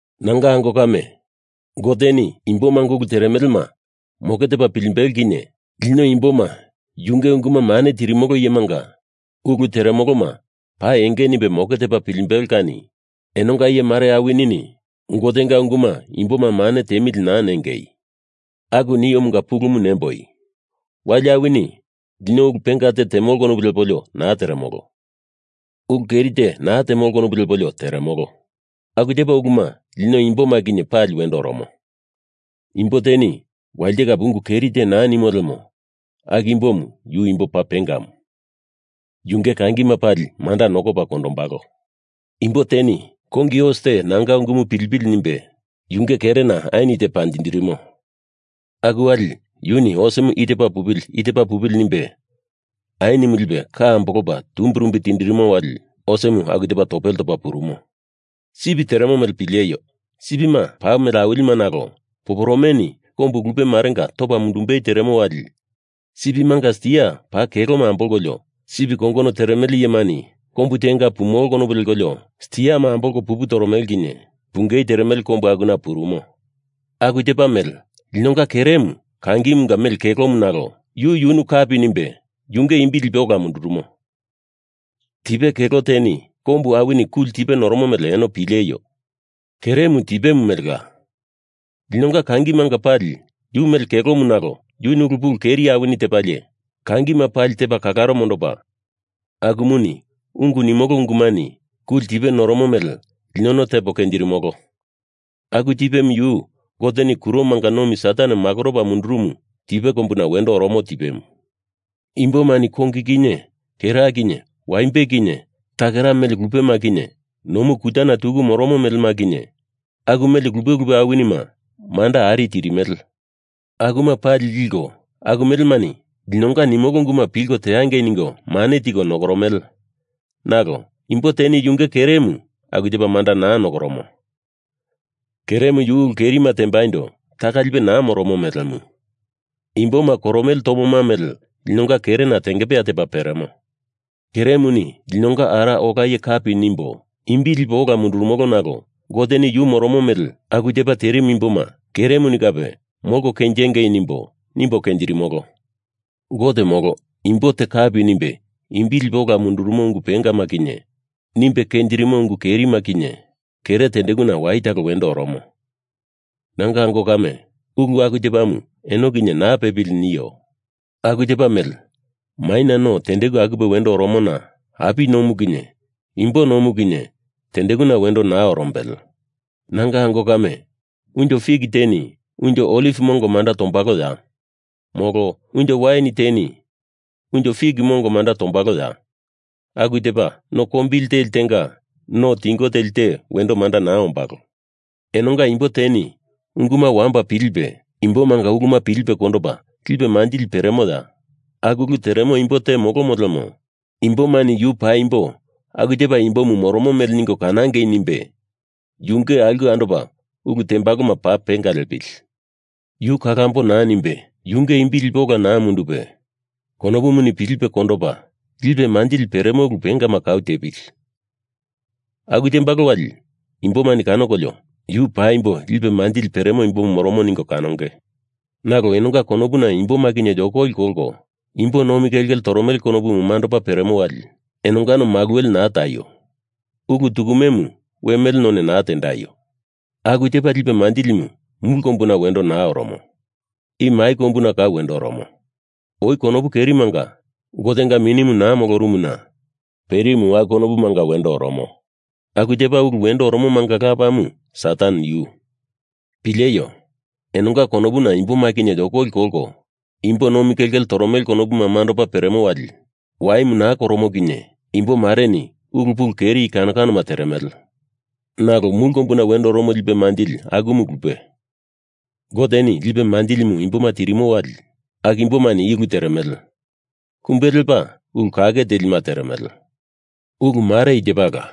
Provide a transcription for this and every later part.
Nanga ango kame, Goteni imbomanga ulu teremelema moke tepa pilimbelo kinye lino imboma yunge unguma mane tirimolo iyemanga ulu teremoloma paa enge nimbe moke tepa pilimbelo kani enonga iye mare awinini Gotenga unguma imboma mane tiemili naa nengei. Aku niomunga pulumu nemboi, wali awini lino ulu penga te temolo konopu lepolio naa teremolo. Ulu keri te naa temolo konopu lepolio teremolo. Aku tepa uluma lino imboma kinye pali wendo oromo. Imbo teni walite kape ungu keri te naa nimo lemo aku imbomu yu imbo paa pengamu, yunge kangima pali manda nokopa kondombalo. Imbo teni kongi os te nanga ungumu pilipili nimbe yunge kerena ain te panjindirimo. Aku wali yuni osemu i tepa pupili, i tepa pupili nimbe ainimu lipe ka ambolopa tumbirumbi tindirimo wali osemu aku tepa topele topa purumo. Sip teremo mele pileio! Sipima paa mele awilima nalo poporomeni kombu lupe marenga topa mundumbei teremo wali sipimanga stia paa keloma ambolkolio sip kongono teremele iyemani kombu tenga pumolo konopu lekolio stiama ambolko pupu toromele kinye pungei teremele kombu akuna purumo. Aku tepa mele linonga keremu kangimunga mele kelomu nalo yu yunu kapi nimbe yunge imbi lipe ola mundurumo. Tipe kelo teni kombu awini kuli tipe noromo mele eno pileio! Keremu tipe melela. Linonga kangimanga pali yu mele kelomu nalo yuni ulu pulu keri awini tepalie kangima pali tepa kalaro mondopa, akumuni ungu nimolo ungumani kuli tipe noromo mele linono tepo kenjirimolo. Aku tipemu yu Goteni kuromanga nomi Satan makoropa mundurumu tipe kombuna wendo oromo tipemu. Imbomani kongi kinye kera kinye waimbe kinye takera mele lupema kinye nomu kutana tuku moromo melema kinye aku mele lupe lupe awinima manda ari tirimele. Akuma pali liko aku melemani linonga nimolo unguma pilko teangei ningo mane tiko nokoromele, nalo imbo teni yunge keremu aku tepa manda naa nokoromo. Keremu yu ulu kerima tembaindo taka lipe naa moromo melemu. Imboma koromele tomoma mele linonga kerena tengepeya tepa peremo. Keremuni linonga Ara Ola Iye kapi nimbo imbi lipo ola mundurumolo nalo Goteni yu moromo mele aku tepa terimu imboma keremuni kape molko kenjengei nimbo, nimbo kenjirimolo. Gote, molo imbo te kapi nimbe imbi lipe ola mundurumo ungu pengama kinye nimbe kenjirimo ungu kerima kinye kere tendekuna waye talo wendo oromo. Nanga ango kame, ulu aku tepamu eno kinye naa pepili nio. Aku tepa mele maina no tendeku akupe wendo oromona api nomu kinye imbo nomu kinye tendekuna wendo naa orombele. Nanga ango kame, unjo fik teni unjo oliv mongo manda tombaloya? Molo, unjo wain teni unjo fik mongo manda tombaloya? Aku tepa, no kombili teli tenga no tingo teli te manda wendo naa ombalo. Enonga imbo te unguma wamba pilipe, imbomanga uluma pilipe kondopa, lipe manjili peremoya? Aku ulu teremo imbo te molomo lemo imbomani yu paimbo aku tepa imbomu moromo mele ningo kanangei nimbe yunge aulke andopa ulu tembaloma paa penga liepili. Yu kalambo naa nimbe yunge imbi lipe ola naa mundupe, konopuni pilipe kondopa, lipe manjili peremo ulu pengama kau tepili. Aku tembalo wali imbomani kanokolio yu paimbo lipe manjili peli imbomu moromo ningo kanonge. Nalo enonga konopuna imboma kinye yokoli kolko imbo nomi kelkele toromele konopu mandopa peremo wali enongano maluwele naa taio. Ulu tukumemu we mele none naa tendaio. Aku tepa lipe manjilimu mulu kombuna wendo naa oromo. I mai kombuna kau wendo oromo. Oi konopu kerimanga Gotenga Minimu naa molorumuna perimu aku konopumanga wendo oromo. Aku tepa ulu wendo oromomanga lapamu Satan yu. Pileio! Enonga konopuna imboma kinye yokoli kolko imbo nomi kelkele toromele konopu mandopa peremo wali waimu naa koromo kinye imbo mareni ulu pulu keri i kano kanoma teremele. Nalo mulu kombuna wendo oromo lipe manjili akumu lupe. Goteni lipe manjilimu imboma tirimo wali aku imbomani i ulu teremele: Kumbe lepa ulu kake telima teremele. Ulu mare i tepala: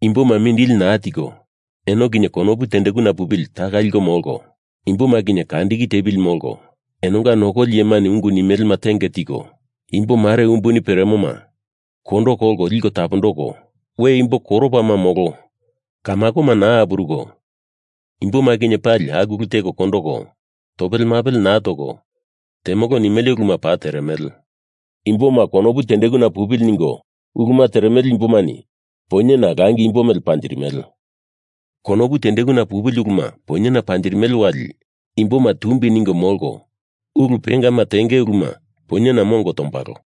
imboma mindili naa tiko eno kinye konopu tendekuna pupili taka liko molko, imboma kinye kandiki tepili molko, enonga nokoli iyemani ungu nimelema tenge tiko, imbo mare umbuni peremoma kondo kolko liko tapondoko, we imbo koropama molo kamakoma naa apuruko imboma kinye pali aku ulu teko kondoko, topele mapele naa toko temolo nimele uluma paa teremele. Imboma konopu tendekuna pupili ningo uluma teremele imbomani poinyena langi imbo mele panjirimele. Konopu tendekuna pupili uluma poinyena panjirimele wali imboma tumbi ningo molko ulu pengama tenge uluma poinyena mongo tombalo.